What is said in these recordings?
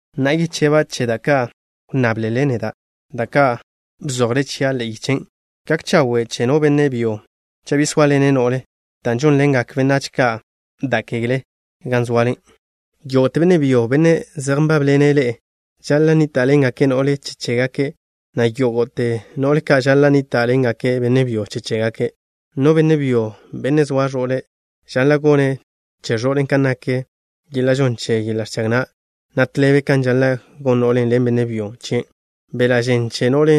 Na'a, yecheba' che da' ka' wnnáblele neda', da' ka' bzojle chia' ḻe'e yichen'. Gak chawe' che no benne' byo cha' bi sóaḻene' no'le. Dan' žónḻe'egak benách ka' da' kegle gan zoale, yógo'te benne' byo, benne' zej nbábḻene' ḻe'e žaḻa' nníta'ḻengake' no'le che chégake', na' yógo'te no'le ka' žaḻa' nníta'ḻengake' benne' byo che chégake'. No benne' byo, benne' zoa ẕo'le', žaḻa' gone' che ẕo'le' kan nak yeḻa' žon che yeḻa' ẕchag na', na' tḻebe kan žaḻa' gon no'len' ḻen benne' byo chien'. Beḻa' žen che no no'le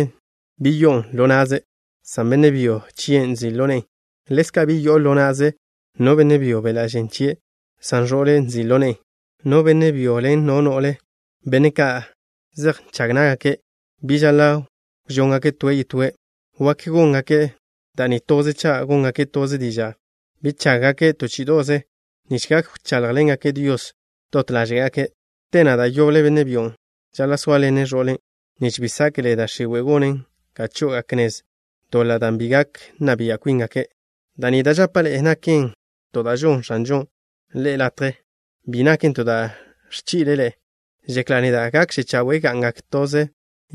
bi yo'on ḻo na'ze', san benne' byo chien' nzi' ḻo ne'en. Ḻezka', bi yo'o ḻo na'ze no benne' byo beḻa' žen chie', san ẕo'le' nzi' ḻo ne'en. No benne' byo ḻen no no'le, benne' ka' zej nžag ná'gake', bi žaḻa' wžóngake' toe' yetóe'. Wak góngake' da' ni toze cha' góngake' toze diža' bi chággake' to chí'ido'ze nich gak wcháḻjḻengake' Dios dot ḻáže'gake'. Te na', da' yoble benne' byon' žaḻa' sóaḻene' ẕo'le', nich bi sáke'le da' x̱iwe' gonen ga chó'ogake' nez doḻa' dan' bi gak nna bia' kwíngake'. Da' ni da' žapa' ḻe'e naken to da' žonn X̱anžon' ḻe'e latje. Bi naken to da' ẕchi'le' ḻe'e. Žekla' neda' gakže chawe' ga'ngak toze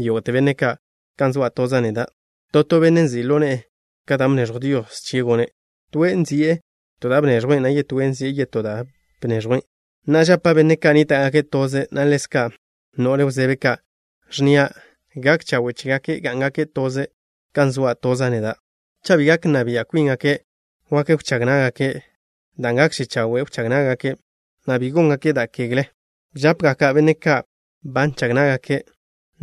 yógo'te benne' ka', kan zoa' toza' neda'. To to benne' nzi' ḻo ne'e ka da' bneẕjw Dios chie' gone'. Toe' nzi'e to da' bneẕjwen', na' yetóe' nzi'e yetó da' bneẕjwen'. Na'a, žapa' benne' ka' nníta'gake' toze, na' ḻezka' no'le wzebe ka', ẕnnia': gak chawe' chégake' gá'ngake' toze kan zoa' toza' neda'. Cha' bi gak nna bia' kwíngake', wak wchág ná'gake', dan' gakže chawe' wchág ná'gake', na' bi se ḻáže'gake' da' kegle. Žápgaka' benne' ka' ba nžag ná'gake',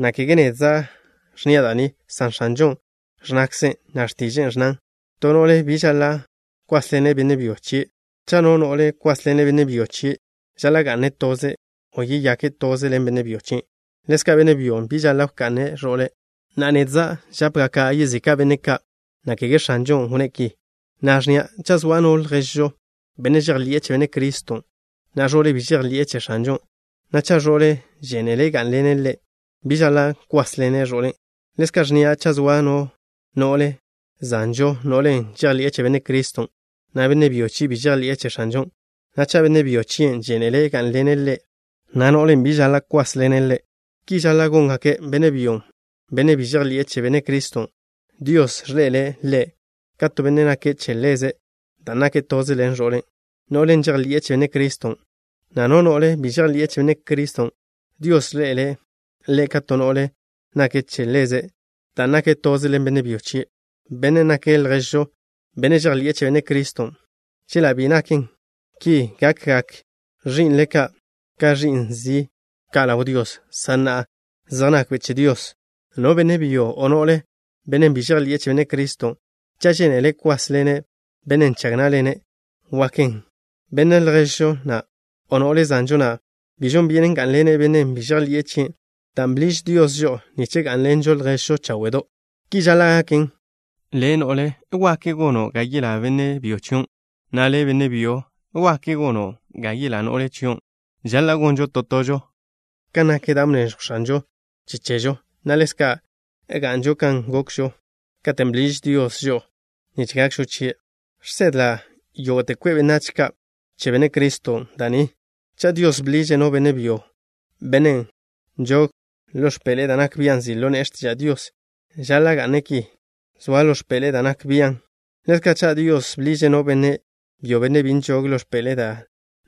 na' kege nedza' ẕnnia' da' ni, san X̱anžon' ẕnnakzen', na' x̱tiže'e ẕnnan: “To no'le bi žaḻa' kwásḻene' benne' byo chie'.” Cha' no no'le kwásḻene' benne' byo chie', žaḻa' ga'ne' toze', o yeyake' toze ḻen benne' byo chien'. Ḻezka' benne' byo bi žaḻa' wka'ne' ẕo'le'. Na'a, nedza' žápgaka' yezika' benne' ka', na' kege X̱anžon' wnné' ki, na' ẕnnia': cha' zoa no lježžo, benne' žejḻi'e che Benne' Criston', na' ẕo'le' bi žejḻi'e che X̱anžon', na' cha' ẕo'le' žénele' gá'nḻene' ḻe', bi žaḻa' kwásḻene' ẕo'len'. Ḻezka' ẕnnia': cha' zoa no no'le zanžo, no'len' žejḻi'e che Benne' Criston', na' benne' byo chie' bi žejḻi'e che X̱anžon', na' cha' benne' byo chien' žénele' gá'nḻene' ḻe', na' no'len' bi žaḻa' kwásḻene' ḻe'. Ki žaḻa' góngake'. Benne' byon', benne' bi žejḻi'e che Benne' Criston', Dios ẕḻe'ele' ḻe' ka to benne' nake' che Ḻeze' dan' nake' toze ḻen ẕo'le', no'len' žejḻi'e che Benne' Criston', na' no no'le bi žejḻi'e che Benne' Criston', Dios ẕḻe'ele' ḻe' ka to no'le nake' che Ḻeze' dan' nake' toze ḻen benne' byo chie', bennen' nake' lježžo, benne' žejḻi'e che Benne' Criston'. Chela' bi naken ki, gakgak ẕi'nle ka' ka ẕi'n zi' ka' ḻaw Dios. San na'a, zej nakbe' che Dios. No benne' byo, o no'le, bennen' bi žejḻi'e che Benne' Criston', cha' žénele' kwásḻene' bennen' nžag ná'ḻene', waken. Benne' lježžo na', o no'le zanžo na', bennen' žejḻi'e che Benne' Criston', bi žon byenen gá'nḻene' bennen' bi žejḻi'e chien', dan' bḻiž Dios žo'o nich gá'nḻenžo lježžo cháwe'do'. Ki žaḻa' gaken. Le', no'le, wak gono' ga yelá benne' byo chion', na' le', benne' byo, wak gono' ga yelá no'le chion'. Žaḻa' gonžo to tožo kan nak da' bneẕjw X̱anžon' che chežo, na' ḻezka' ga'nžo kan gokžo katen' bḻiž Dios žo'o nich gakžo chie'. Žsedla' yógo'te kwe' benách ka' che Benne' Criston' da' ni. Cha' Dios bḻiže' no benne' byo, bennen' nžog ḻo x̱peḻe'e da' nak bia' nzi' ḻo ne'e x̱tiža' Dios, žaḻa' ga'ne' ki, zoa ḻo x̱peḻe'e dan' nak bian'. Ḻezka', cha' Dios bḻiže' no benne' byo, bennen' bi nžog ḻo x̱peḻe'e dan'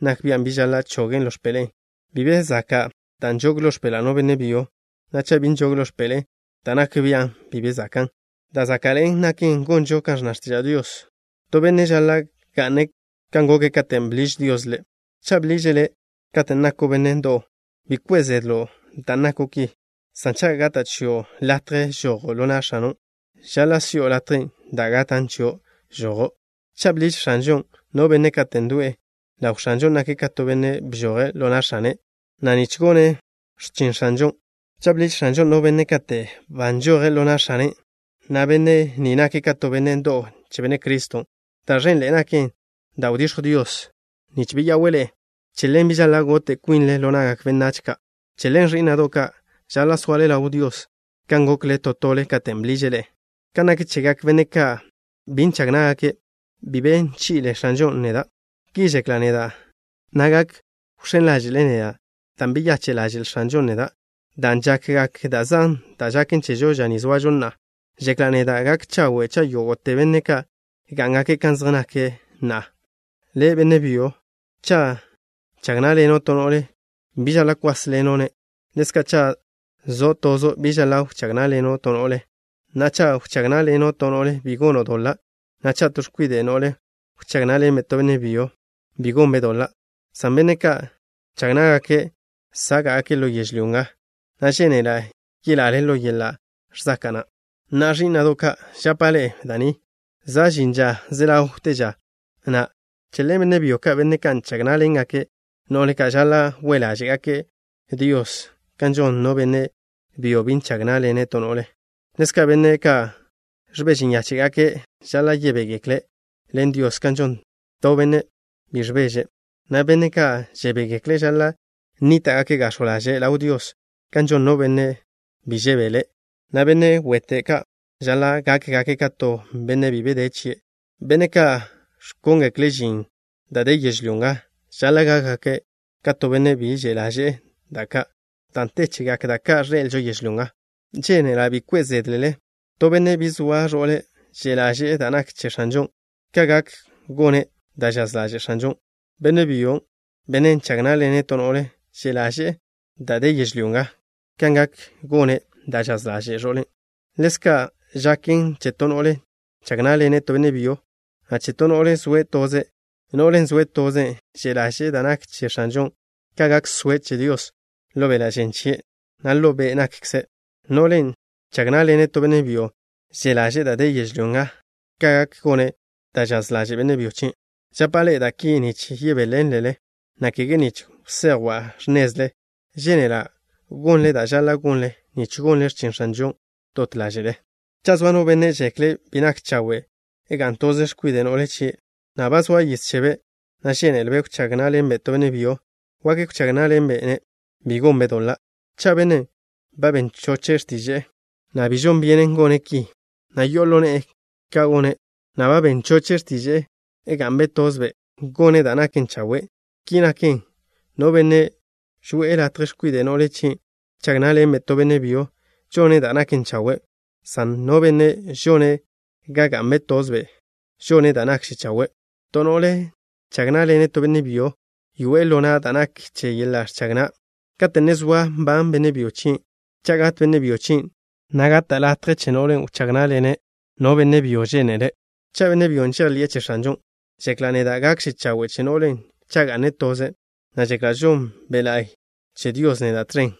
nak bian', bi žaḻa' chogen' ḻo x̱peḻe'e. Bi be zaka' dan' nžog ḻo x̱peḻa' no benne' byo, na' cha' bi nžog ḻo x̱peḻe'e dan' nak bian', bi be zakan'. Da' záka'ḻe'en naken gonžo kan ẕnna x̱tiža' Dios. To benne' žaḻa' ga'ne' kan goke' katen' bḻiž Dios ḻe'. Cha' bḻiže' le' katen' nako' benne' ndo'w, bi kwe' zedlo' dan' nako' ki, san cha' gata' chio' latje žojo' ḻo na' x̱ano', žaḻa' si'o latjen' da' gatan' chio' žojo'. Cha' bḻiž X̱anžon' no benne' kate' ndo'e, ḻaw X̱anžon' nake' ka to benne' bžoje' ḻo na' x̱ane' na', nich gone' x̱chin X̱anžon'. Ḻezka', cha' bḻiž X̱anžon' no benne' kate' ba nžoje' ḻo na' x̱ane' na', benne' ni nake' ka to benne' ndo'w che Benne' Criston'. Da' ẕenḻe'e naken da' wdiẕjw Dios, nich beya'we' ḻe'e. Che ḻen bi žaḻa' gote' kwinle ḻo na'gak benách ka'. Che ḻen, ẕí'na'do' ka', žaḻa' soale ḻaw Dios kan gokle to tole katen' bḻiže' ḻe'e. Kan nak chegak benne' ka' bi nžag ná'gake', bi be bchi'le X̱anžon' neda'. Ki žekla' neda', na' gak wx̱én ḻáže'le neda' dan' beyache' ḻaže'l X̱anžon' neda'. Dan' žakgak da' zan da' žaken chežo ža ni zoažo na'a, žekla' neda' gak chawe' cha' yógo'te benne' ka' gá'ngake' kan zej nake' na'a. Le', benne' byo, cha' nžag ná'ḻeno' to no'le, bi žaḻa' kwásḻeno'-ne'. Ḻezka', cha' zo' tozo', bi žaḻa' wchág ná'ḻeno' to no'le. Na'a, cha' wchág ná'ḻeno' to no'le, bi gono' doḻa', na' cha' to x̱kwide' no'le wchág ná'ḻenbe' to benne' byo, bi gonbe' doḻa', san benne' ka' nžag ná'gake' sáka'gake' ḻo yežlyó nga, na' žénela' yelale ḻo yeḻa' ẕzaka' na'. Na'a, ẕí'na'do' ka', žapa' ḻe'e da' ni: za' žin ža ze ḻawte ža na'. Che ḻen, benne' byo ka', benne' ka' nžag ná'ḻengake' no'le ka', žaḻa' we' ḻáže'gake' Dios kan žon no benne' byo bi nžag ná'ḻene' to no'le. Ḻezka', benne' ka' ẕbeže nyáche'gake' žaḻa' yebégekle' ḻen Dios kan žon to benne' bi ẕbeže', na' benne' ka' žebégekle' žaḻa' nníta'gake' gax̱jw ḻaže' ḻaw Dios kan žon no benne' bi žebele', na' benne' wete' ka' žaḻa' gákgake' ka to benne' bi be de chie'. Benne' ka' ẕkóngekle' žin da' de yežlyó nga žaḻa' gákgake' ka to benne' bi že' ḻaže'e da' ka', dan' te chegak da' ka' ẕḻe'elžo yežlyó nga. Žénela' bi kwe' zédlele. To benne' bi zoa ẕo'le', že' ḻaže'e da' nak che X̱anžon', ka gak gone' da' žaz ḻaže' X̱anžon'. Benne' byon', benne' nžag ná'ḻene' to no'le, že' ḻaže'e da' de yežlyó nga, ka gak gone' da' žaz ḻaže' ẕo'le'. Ḻezka' žaken che to no'le nžag ná'ḻene' to benne' byo, na' che to no'le zoe' toze'. No'len' zoe' toze' že' ḻaže'e da' nak che X̱anžon', ka gak soe' che Dios ḻo beḻa' žen chie', na' ḻo be' nakkze'. No'len' nžag ná'ḻene' to benne' byo že' ḻaže'e da' de yežlyó nga, ka gak gone' da' žaz ḻaže' benne' byo chien'. Žapa' ḻe'e da' ki nich yebéḻenlelen, na' kege nich wsejwa' x̱nezle. Žénela' gonle da' žaḻa' gonle, nich gonle x̱chin X̱anžon' dot ḻáže'le. Cha' zoa no benne' žekle' bi nak chawe' ga'n toze x̱kwide' no'le chie', na' ba zoa yiz chebe', na' žéneḻe'elbe' wchág ná'ḻenbe' to benne' byo, wak wchág ná'ḻenbe'-ne'. Bi gonbe' doḻa'. Cha' bennen' ba ben choche' x̱tiže'e, na' bi žon byenen gone' ki, na' yo'o ḻo ne'e ka gone', na' ba ben choche' x̱tiže'e ga'nbe' tozbe', gone' da' naken chawe'. Ki naken, no benne' žoe'e latje x̱kwide' no'le chie' wchág ná'ḻenbe' to benne' byo, žone' da' naken chawe', san no benne' žone' ga ga'nbe' tozbe' žone' da' nakže chawe'. To no'le nžag ná'ḻene' to benne' byo, yoe'e ḻo na' da' nak che yeḻa' ẕchag na' kate' ne zoa nban benne' byo chien'. Cha' gat benne' byo chien', na' gata' ḻo na' no'len' wchág ná'ḻene' no benne' byo žénele', cha' benne' byon' žejḻi'e che X̱anžon'. Žekla' neda' gakže chawe' che no'len' cha' ga'ne' toze', na' žekla' žon Be' La'y che Dios neda' tẕen.